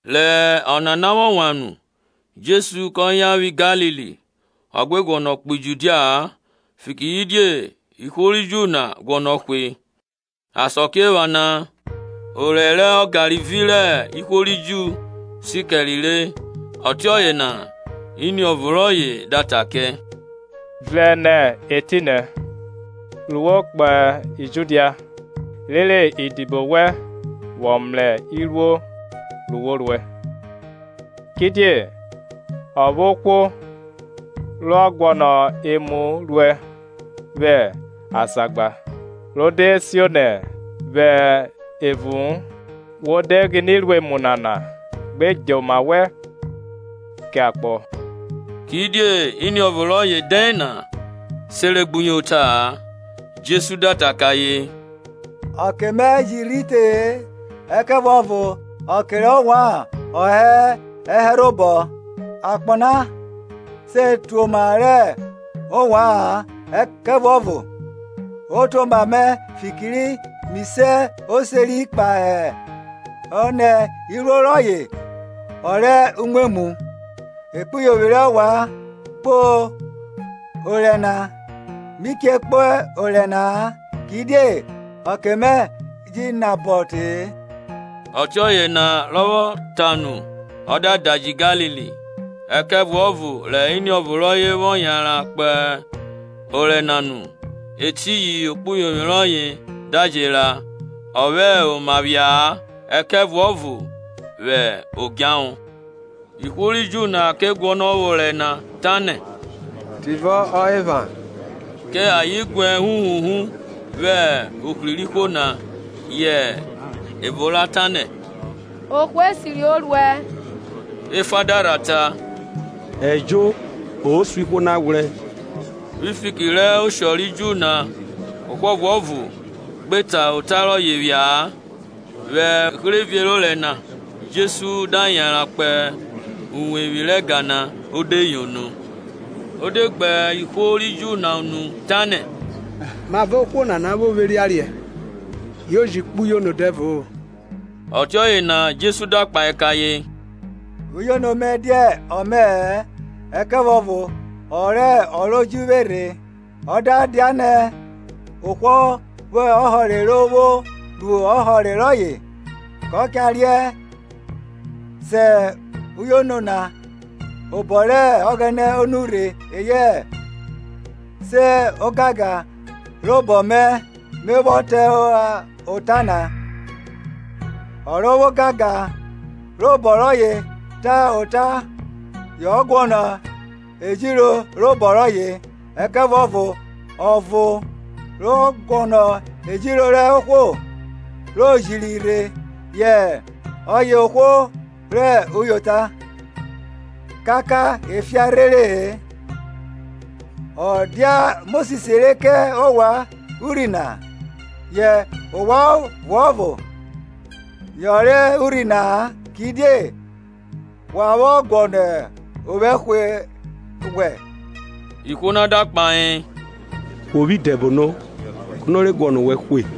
Rẹ ọnana vwọ wan nu Jesu kẹ yan vwi Galili; ọ gbe guọnọ kpo Judia-a, fikiridie ihwo ri Ju na guọnọ hwe. Asakiephana orẹ rẹ Ọgarivi rẹ ihwo ri Ju si kẹre re. Ọtiọye na iniọvo rọye da ta kẹ, Vrẹn nẹ etinẹ re wo kpo Judia, rere idibo wẹn vwọ mrẹ iruo ru wo ruẹ. Kidie o vwo ohwo rọ guọnọ emu ruẹ vwẹ azagba ro de sionẹ vwẹ uvu-un. Wo de gbine ruẹ imu nana, gbe dje oma wẹn kẹ akpọ. Kidie iniọvo rọye dẹn na seregbuyota-a. Jesu da ta kẹ ayen, Ọke mẹ ji rhi te-e, ẹkẹvuọvo ọke rẹ ovwan ọ hẹ obọ rẹ ovwan. Akpọ na se tuoma rẹ ovwa-an, ẹkẹvuọvo o tuoma mẹ fikiridie mi se oseri kpahọ nẹ iruo rọye ọ rẹ uvumwemwu. Ekpuyovwi rẹ ovwan se kpo orẹ na; mi che kpo orẹ na-a, kidie ọke mẹ je nabọ te-e. Ọtiọye na rọ vwọ ta nu, ọ da daji Galili. Ẹkẹvuọvo rẹ Iniọvo rọye vwọ yanran kpo orẹ na nu, etiyin ekpuyovwi rọye da je ra, ọ vwẹ oma phia-a ẹkẹvuọvo vwẹ odjahọ. Ihwo ri Ju na ke guọnọ vwẹ orẹ na, tanẹ, Tivọ ọ epha? Kẹ ayen guẹ huhuhu vwẹ ohri rẹ ihwo na. Yẹ evo ra tanẹ, Ohwo esiri o ruẹ, Efa da rha ta, Ejo, o suẹn ihwo na ghwrẹ. Vwi fiki rẹ osho ri Ju na ohwo ọvuọvo gbe ta ota rọye phia-a. Vwẹ uherevie rẹ orẹ na Jesu da yanran kpo uwevwi rẹ ẹga na o de yono. Ọ de gbe ihwo ri Ju na unu, tanẹ, Mavọ ohwo nana vwo vwo erianriẹn, yo ji kpo uyono dẹvo-o? Ọtiọye na Jesu da kpahe kẹ ayen, uyono mẹ dia ọmẹ-ẹ, ẹkẹvuọvo ọ rẹ o ro ji vwe rhe; ọ da dianẹ ohwo vwo ọhọre ro vwo ru ọhọre rọye gba, ko cha riẹn sẹ uyono na obọ rẹ Ọghẹnẹ o nurhe eyẹ se ogangan robọ mẹ me vwọ ta ota na. Ọ rọ vwẹ ogangan robọ rọye ta ota yọ guọnọ urinrin robo rọye; ẹkẹvuọvo ọ rọ guọnọ urinrin rẹ ohwo ro jiro rhe yẹ ọye ohwo rẹ uyota, kaka efian rhere-e. Ọ dia Mosis re kẹ ovwan urhi na? Yẹ ovwan ọvuọvo yọnre urhi na-a. Kidie wa vwọ guọnọ ovwẹ hwe? Ihwo na da kpahe, Wo vwo idẹbono! Kono re guọnọ owẹ hwe?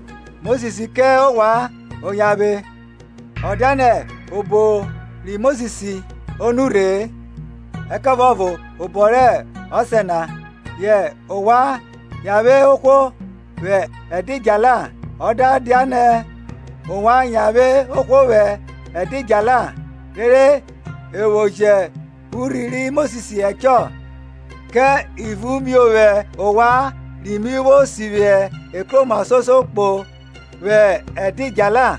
Mosis kẹ ovwan oyanvwe ọ dianẹ obọ ri Mosis o nurhe-e, ẹkẹvuọvo obọ rẹ ọsẹ na, yẹ ovwan yanvwe ohwo vwẹ edidjala. Ọ da dianẹ ovwan yanvwe ohwo vwẹ ẹdidjala, rere e vwo jẹ urhi ri Mosis ẹchọ, kẹ ivun miovwẹ ovwan ri mi vwo sivwi ekroma soso vwẹ ẹdidjala?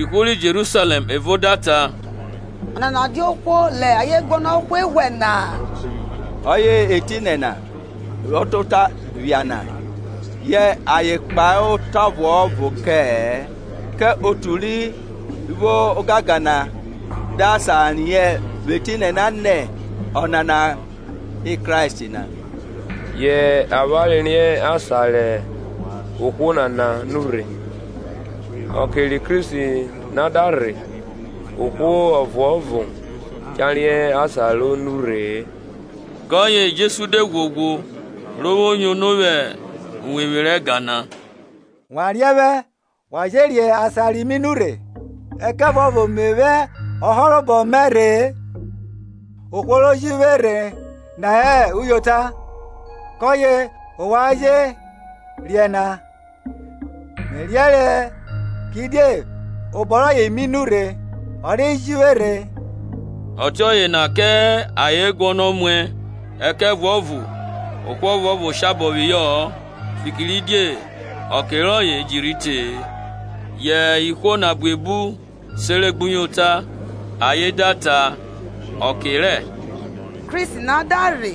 Ihwo ri Jerusalẹm evo da ta, Ọnana dia ohwo rẹ ayen guọnọ hwe na-a? Ọye hẹ etinẹ na, rọ ta ota vwẹ azagba na, yẹ ayen kpahe ota ọvuọvo kẹ-ẹ. Kẹ otu ri vwo ogangan rẹ usuo na sa riẹn nẹ ọnana hẹ Kristi na? Avwanre riẹn asan rẹ ohwo nana nurhe; ọke ri Kristi na da rhe, ohwo ọvuọvo cha riẹn asan ro nurhe-e. Kọye Jesu de ghwoghwo, ro vwo yono vwẹ uwevwi rẹ ẹga na, Wa riẹn vwẹ, wa je riẹn asan ri mi nurhe? Ẹkẹvuọvo me vwẹ ọhọrobọ mẹ rhe-e; ohwo ro ji vwe rhe na hẹ uyota, kọye ovwan jẹ riẹn na. Me riẹnrẹ, kidie obọ rọye mi nurhe, ọye ri ji vwe rhe. Ọtiọye na kẹ ayen guọnọ muẹ; ẹkẹvuọvo ohwo ọvuọvo shabọ phihọ-ọ, fikiridie ọke rọye ji rhi te-e. Yẹ ihwo na buebu sere gbuyota; ayen da ta, Ọke rẹ Kristi na da rhe,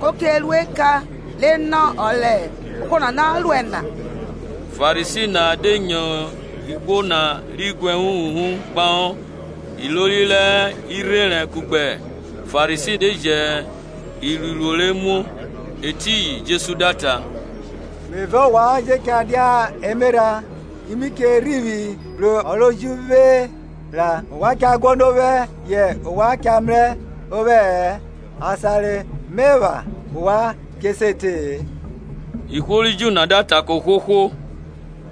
ko che ru eka re nọ ọ rẹ ohwo nana ruẹ na? Farisi na de nyo ihwo na ri guẹ huhuhu kpahọ, ilori rẹ irherẹn kugbe Farisi de ji iruiruo re muo. Etiyin Jesu da ta, Me vẹ ovwan je cha dia emerha, ki mi che rhivwi bru ọ ro ji vwe ra; ovwan cha guọnọ ovwẹ yẹ ovwan cha mrẹ vwẹ-ẹ; asan re me epha ovwan che se te-e. Ihwo ri Ju na da ta kẹ ohwohwo,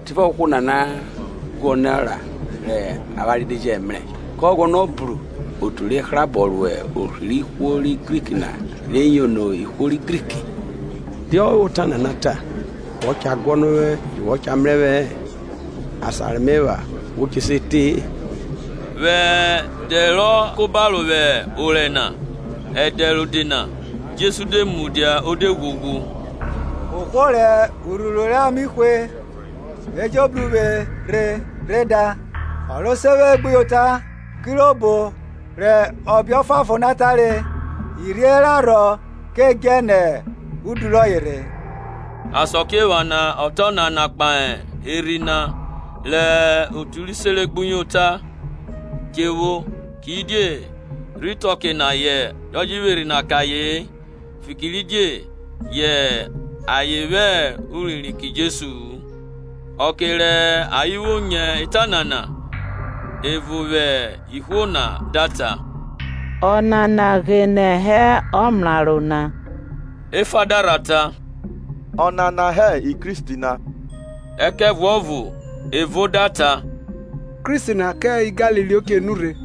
Tivọ ohwo nana guọnọ ra rẹ avwanre de jẹ mrẹ? Kọ guọnọ bru otu re hrabọ ro ohri rẹ ihwo ri Grik na re yono ihwo ri Grik? Die ọ vwẹ ota nana ta, Wọ cha guọnọ ovwẹ yu wo cha mrẹ vwẹ-ẹ, Asan re me epha we che se te-e? Vwẹ ẹdẹ rọ ka oba vwẹ orẹ na, ẹdẹ rode na, Jesu de mudia o de ghwoghwo, Ohwo rẹ urhuru rẹ ame hwe, e jo bru uvwe rhe rhe da. Ọ ro se vwe gbuyota, kirobo rẹ ọbe ọfuanfon na tare, Irhie rẹ arhọ ke djẹ nẹ udu rọye rhe. Asakiephana ọ ta ọnana kpahe Erhi na, rẹ otu ri sere gbuyota che vwo; kidie rhi te ọke na yọ je vwẹ Erhi na kẹ aye-en, fikiridie yẹ a je vwẹ urinrin na kẹ-ẹ. Ọke rẹ ayen vwo nyo eta nana, evo vwẹ ihwo na da ta, Ọnana ghene hẹ ọmraro na. Efa da rha ta, Ọnana hẹ Kristi na. Ẹkẹvuọvo evo da ta, Kristi na kẹ Galili o che nurhe?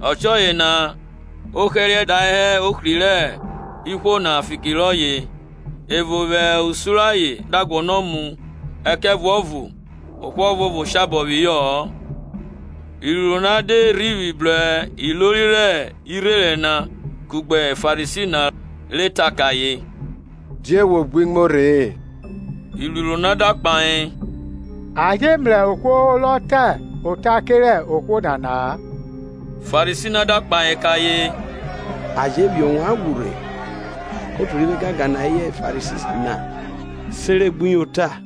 Ọtiọye na ohẹriẹ da hẹ ohri rẹ ihwo na fiki rọye. Evo vwẹ usun rẹ ayen da guọnọ mu, ẹkẹvuọvo ohwo ọvuọvo shabọ phihọ-ọ. Iruiruo na de rhivwi bru ilori rẹ irherẹn na kugbe Farisi na, re ta kẹ ayen, Die we gbi muo rhe-e? Iruiruo na da kpahe, A je mrẹ ohwo rọ ta ota kerẹ ohwo nana-a. Farisi na da kpahe kẹ ayen, A je phiẹn ovwan ghwru rhe? Kẹ otu ri vwo ogangan na eyẹ Farisi na sere gbuyota?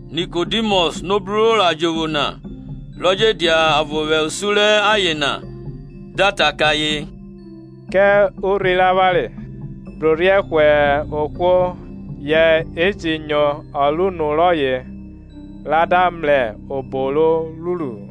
Nikodimọs, rọ bru ro ra jovwo na, rọ je dia ọvo vwẹ usun rẹ ayen, da ta kẹ ayen, Kẹ urhi rẹ avwanre brorhiẹ hwe ohwo ye ji nyo ọ rẹ unu rọye ra da mrẹ obo ro ruru-u?